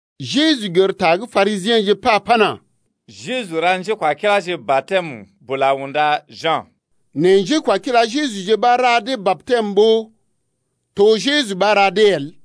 Jeju gər ta gə́ Parisiḛje pa pana: Jeju ra njékwakiláje batɛm bula unda Ja̰. Nɛ njékwakila Jejuje ɓa ra dee batɛm ɓó to Jeju ɓa ra dee el.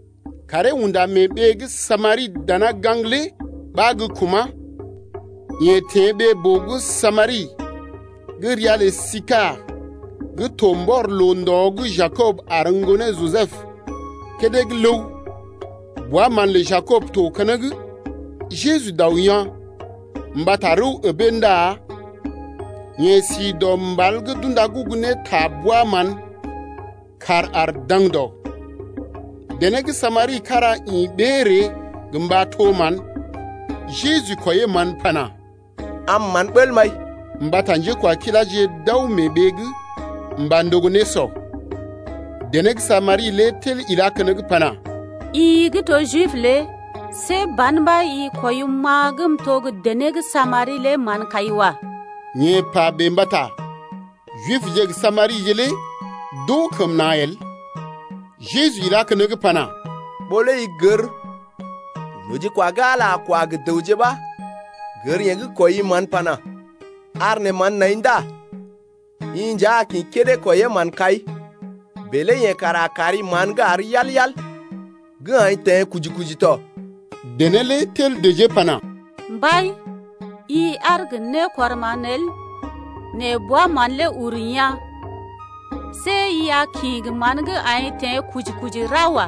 Karee unda mee ɓee gə́ Samari dana gaŋg lé ɓa gə kuma̰. Yeḛ teḛ ɓee-boo gə́ Samari gə́ ria lə Sishar gə́ to mbɔr loo-ndɔ gə́ Jakob ar ŋgonee Jisəb kédé gə́ ləw. Bwa-mán lə Jakob to keneŋ. Jeju dao yaa̰ mbata rəw əbee ndá yeḛ si dɔ mbal gə́ d’unda gugu ne ta bwa-mán. Kàr ar daŋdɔ. Dené gə́ Samari kára ḭ ɓee ree gə mba to mán. Jeju kwɔiyee mán pana: Am mán bəl m’ai. Mbata njékwakiláje d’aw mee ɓee’g mba ndogo nésɔ. Dené gə́ Samari lé tel ilá keneŋ pana: I gə́ to Jib lé see ban ɓa i kwɔim-ma gə́ m’to gə́ dené gə́ Samari lé mán-kai wa. (Yeḛ pa bèe mbata Jibje gə Samarije lé d’oo kəm na̰ el.) Jeju ilá keneŋ pana: Ɓó lé i gər nojikwa gə́ Ala lé a kwa gə dəwje ɓa gər yeḛ gə́ kwɔii mán pana: Ar neḛ mán n’ai ndá i nja a kḭ kédé kwɔiyee mán-kai, bèe lé yeḛ kara a kari mán gə́ àr yal-yal gə́ aḭ teḛ kuji-kuji tɔ. Dené lé tel dəjee pana: Mbai, i aar gə nékɔrman el nɛ bwa-mán lé uru yaa̰. See i a kḭ gə mán gə́ aḭ teḛ kuji-kuji lé ra wa.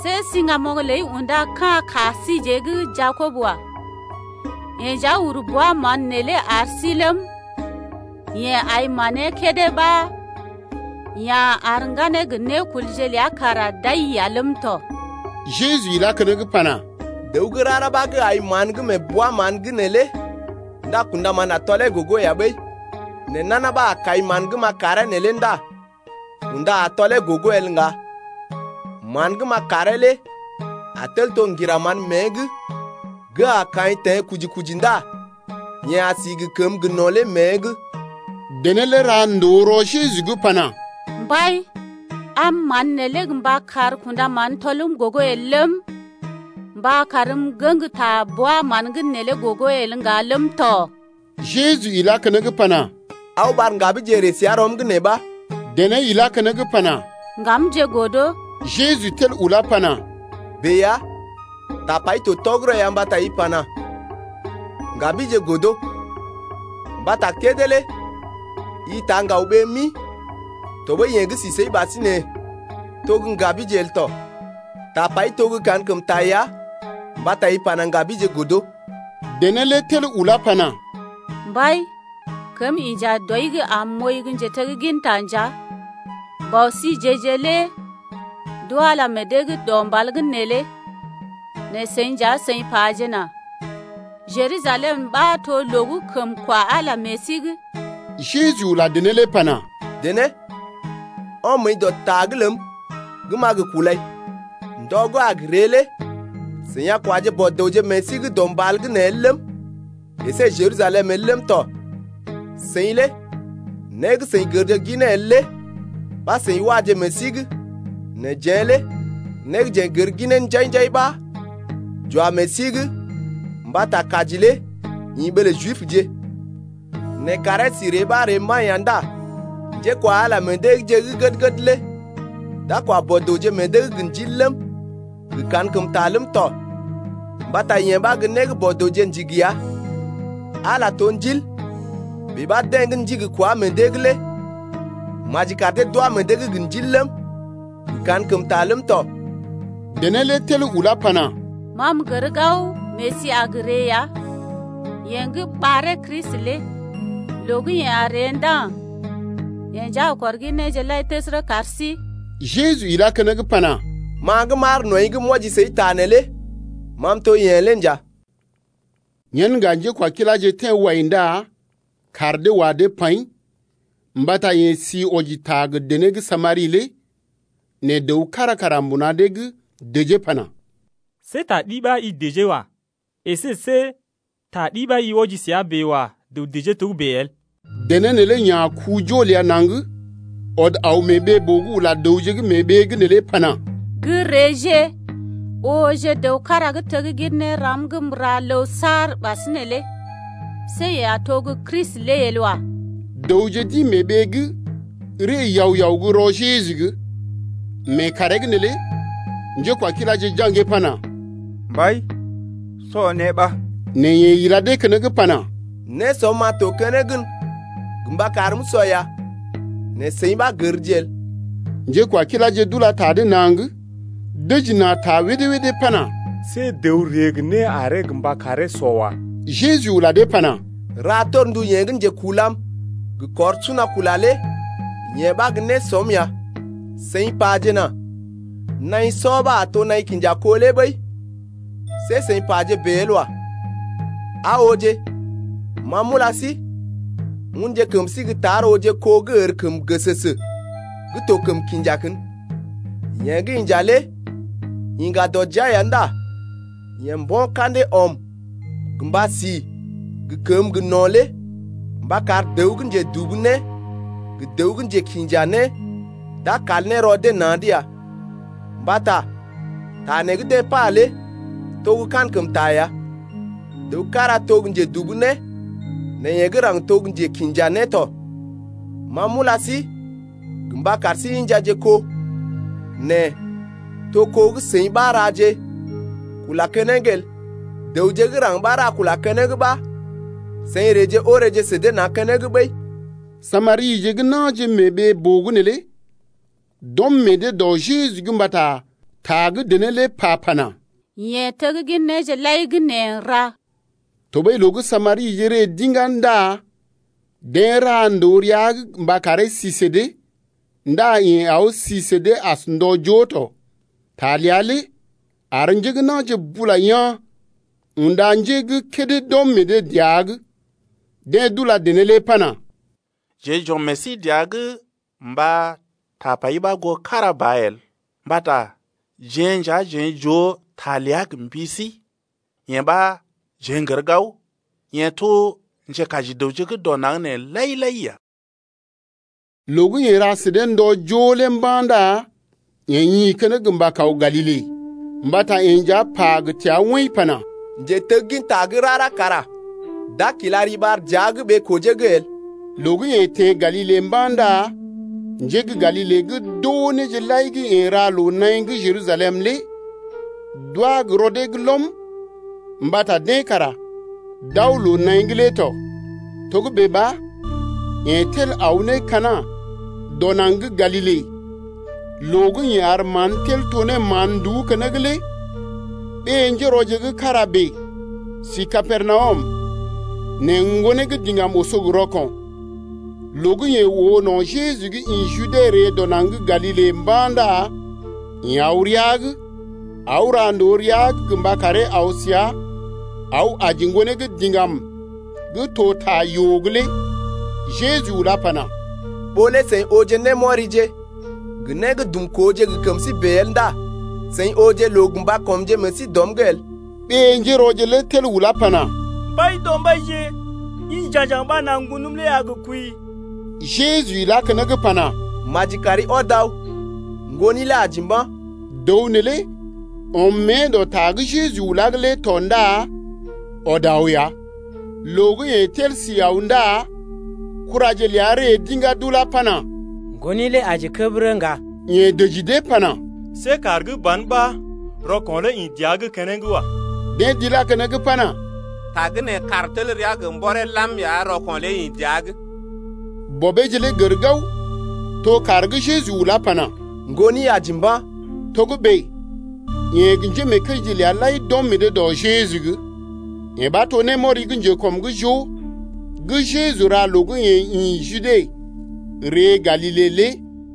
See siŋgamoŋ ləi unda ka̰ ka síjeḛ gə́ Jakob wa. Yeḛ nja uru bwa-mán neelé ar sí ləm, yeḛ ai manee kédé ɓa ya̰ ar ŋganee gə nékulje ləa kara d’ai ya ləm tɔ. Jeju ilá keneŋ pana: Dəw gə́ rara ɓa gə́ ai mán gə́ mee bwa-mán’g neelé ndá kṵdaman a tɔlee gogo ya ɓəi. Nɛ nana ɓa a kai mán gə́ m’a karee neelé ndá kunda a tɔlee gogo el ŋga. Man gə́ m’a karee lé a tel to ŋgira mán mée’g gə́ a kaḭ teḛ kuji-kuji ndá yeḛ a si gə kəmə gə́ gə no̰ lé mée’g. Dené lé ra ndòo rɔ Jeju’g pana: Mbai, am mán neelé gə mba kar kṵdaman tɔlm gogo el ləm, mba karm m’ŋgəŋ ta bwa-mán’g neelé gogo el ŋga ləm tɔ. Jeju ilá keneŋ pana: Aw ɓar ŋgabije ree səa rɔm’g nee ɓa. Dené ilá keneŋ pana: Ŋgamje godo. Jeju tel ulá pana: Bèe ya, tapai to tɔgərɔ ya mbata i pana: Ŋgabije godo. Mbata kédé lé i taa ŋgawje ɓee mi tɔɓəi yeḛ gə́ sí səi ɓasinè to gə́ ŋgabije el tɔ. Tapai to gə́ kankəmta ya mbata i pana: Ŋgabije godo. Dené lé tel ulá pana: Mbai, kəm inja dɔi’g am m’ooi gə́ njetegginta nja. Bɔ síje-je lé d’wa Ala meḛ dee’g dɔ mbal’g neelé nɛ seḭ nja seḭ pajena: Jerusalem ɓa to loo gə́ kəm kwa Ala meḛ sí’g. Jeju ula dené lé pana: Dené, ɔm məəi dɔ ta’g ləm gə́ m’a gə kulai. Ndɔ gə́ a gə ree lé seḭ a kwaje Bɔ-dəwje meḛ sí dɔ mbal’g nee el ləm, əsé Jerusalem el ləm tɔ. Seḭ lé né gə́ seḭ gərje ginee el lé ɓa seḭ waje meḛ sí’g, nɛ jeḛ lé né gə́ jeḛ n’gər ginee njai-njai ɓa j’wá meḛ sí’g mbata kaji lé ḭ ɓee lə Jibje. Nɛ kàree sí ree ɓa ree mba̰ ya ndá njékwa Ala lé meḛ dee’gje gə́ gəd-gəd lé d’a kwa Bɔ-dəwje meḛ dee’g gə ndil ləm, gə kankəmta ləm tɔ, mbata yee ɓa gə́ né gə́ Bɔ-dəwje ndigi ya. Ala to Ndil, bèe ɓa deḛ gə́ ndigi kwá meḛ dee’g lé maji kar dee d’wá meḛ dee’g gə Ndil ləm, gə kankəmta ləm tɔ. Dené lé tel ulá pana: Ma m’gər gao Mesi a gə ree ya (yeḛ gə́ ɓaree Kristi lé) loo gə́ yeḛ a ree ndá yeḛ nja a kɔr gin néje lai təsərə kar sí. Jeju ilá keneŋ pana: Ma gə́ m’aar nɔḭ’g m’wɔji səi ta neelé ma m’to gə́ yeḛ lé nja. Yen ŋga njékwakiláje teḛ wai ndá kaar dee wa dee paḭ mbata yeḛ si wɔji ta gə dené gə́ Samari lé. Nɛ dəw kára kara mbuna dee’g dəjee pana: See ta ɗi ɓa i dəjee wa. Esé see ta ɗi ɓa i wɔji səa bèe wa dəw dəjee togə́bè el. Dené neelé ya̰ ku-jo ləa naŋg ɔd aw mee ɓee-boo’g ula dəwje gə́ mee ɓee’g neelé pana: Gə́ reeje ooje dəw kára gə́ teggin néram gə́ m’ra ləw saar ɓasinè lé. See yeḛ a to gə́ Kristi lé el wa. Dəwje d’ḭ mee ɓee’g ree yao-yao gə́ rɔ Jeju’g lé. Mee kàree’g neelé njékwakiláje jaŋgee pana: Mbai, sɔ né ɓa. Nɛ yeḛ ila dee keneŋ pana: Nésɔm-ma to keneŋ gən gə mba karm m’usɔ ya, nɛ seḭ ɓa gərje el. Njékwakiláje d’ula ta dee naŋg dəji na̰ ta wédé-wédé pana: See dəw ree gə né aree gə mba karee sɔ wa. Jeju ula dee pana: Ra torndu yeḛ gə́ njekulam gə kɔr suna kula lé yee ɓa gə́ nésɔm ya. Seḭ pajena: Naḭ sɔ ɓa a to naḭ kinja kó lé ɓəi see seḭ paje bèe el wa. Aa ooje, ma m’ula sí, unje kəm sí gə́ tar ooje kó gə́ ərkəm gəsəsə gə́ to kəm kinja kən. Yeḛ gə́ inja lé iŋga dɔ jia ya ndá yeḛ mbo̰ ka̰dee ɔm gə mba si gə kəməgə́ gə no̰ lé mba kar dəw gə́ njedubu né gə dəw gə́ njekḭja né d’a kal ne rɔ dee na̰’d ya. Mbata ta nee gə́ deḛ pa lé to gə́ kankəmta ya: Dəw kára to gə́ njedubu né nɛ yeḛ gə́ raŋg to gə́ njekḭja né tɔ. Ma m’ula sí gə mba kar sí injaje kó, nɛ to kó gə́ seḭ ɓa raje kula keneŋ el, dəwje gə́ raŋg ɓa ra kula keneŋ ɓa seḭ reeje oreeje sə dee na̰ keneŋ ɓəi. Samarije gə́ na̰je mee ɓee-boo’g neelé d’ɔm meḛ dee dɔ Jeju’g mbata ta gə́ dené pa lé pana: Yeḛ teggin néje lai gə́ neḛ n’ra. Tɔɓəi loo gə́ Samarije ree d’iŋgá ndá deḛ ra ndòo rəa’g gə mba karee si sə dee. Ndá yeḛ aw si sə dee as ndɔ joo tɔ. Ta ləa lé ar njé gə́ na̰je bula yaa̰ unda njé gə́ kédé d’ɔm meḛ dee dəa’g. Deḛ d’ula dené lé pana: Jeḛ j’ɔm meḛ sí dəa’g gə mba tapai ɓa goo kára ba el, mbata jeḛ nja jeḛ j’oo ta ləa gə mbi sí, yee ɓa jeḛ n’gər gao, yeḛ to Njekaji dəwje gə́ dɔ naŋg nee lai-lai ya. Loo gə́ yeḛ ra sə dee ndɔ joo lé mba̰ ndá yeḛ ḭ keneŋ mba kaw Galile, mbata yeḛ nja pa gə təa woḭ pana: Njetegginta gə́ rara kara d’a kila riɓar dəa’g ɓee-kojee’g el. Loo gə́ yeḛ teḛ Galile mba̰ ndá njé gə́ Galile gə́ d’oo néje lai gə́ yeḛ ra loo-naḭ gə́ Jerusalem lé d’wá gə́ rɔ dee’g lɔm mbata deḛ kara d’aw loo-naḭ’g lé tɔ. Togə́bè ɓa yeḛ tel aw ne Kana dɔ naŋg gə́ Galile loo gə́ yeḛ ar mán tel to ne mán-nduú keneŋ lé. Ɓé-njérɔje gə́ kára bèe si Kapernawum nɛ ŋgonee gə́ diŋgam oso gə rɔko̰. Loo gə́ yeḛ oo no̰ Jeju gə́ ḭ Jude ree dɔ naŋg gə́ Galile mba̰ ndá yeḛ aw rəa’g aw ra ndòo rəa’g mba karee aw səa aw aji ŋgonee gə́ diŋgam gə́ to ta yoo’g lé. Jeju ulá pana: Ɓó lé seḭ ooje némɔrije gə né gə́ dumkooje gə kəm sí bèe el ndá seḭ ooje loo gə mba kɔmje meḛ sí dɔm’g el. Ɓé-njérɔje lé tel ulá pana: Mbaidɔmbaije, ḭ ja̰gjaŋ ɓa nà ŋgonəm lé a gə kwəi. Jeju ilá keneŋ pana: Maji kari ɔd aw, ŋgoni lé aji mba̰. Dəw neelé ɔm mée dɔ ta gə́ Jeju ulá’g lé tɔ ndá ɔd aw ya. Loo gə́ yeḛ tel si aw ndá kuraje ləa ree d’iŋgá d’ulá pana: Ŋgoni lé aji kəbərə ŋga. Yeḛ dəji dee pana: See kàr gə́ ban ɓa rɔko̰ lé ḭ dəa’g keneŋ wa. Deḛ d’ilá keneŋ pana: Tagə́nè kàr tel rəa gə mbɔree lam ya rɔko̰ lé ḭ dəa’g. Bɔbeeje lé gər gao, to kàr gə́ Jeju ulá ne pana: Ŋgoni aji mba̰ lé. Togə́bè yeḛ gə njémeekəije ləa lai d’ɔm meḛ dee dɔ Jeju’g. Yee ɓa to némɔri gə́ njekɔm’g joo gə́ Jeju ra loo gə́ yeḛ ḭ Jude ree Galile lé.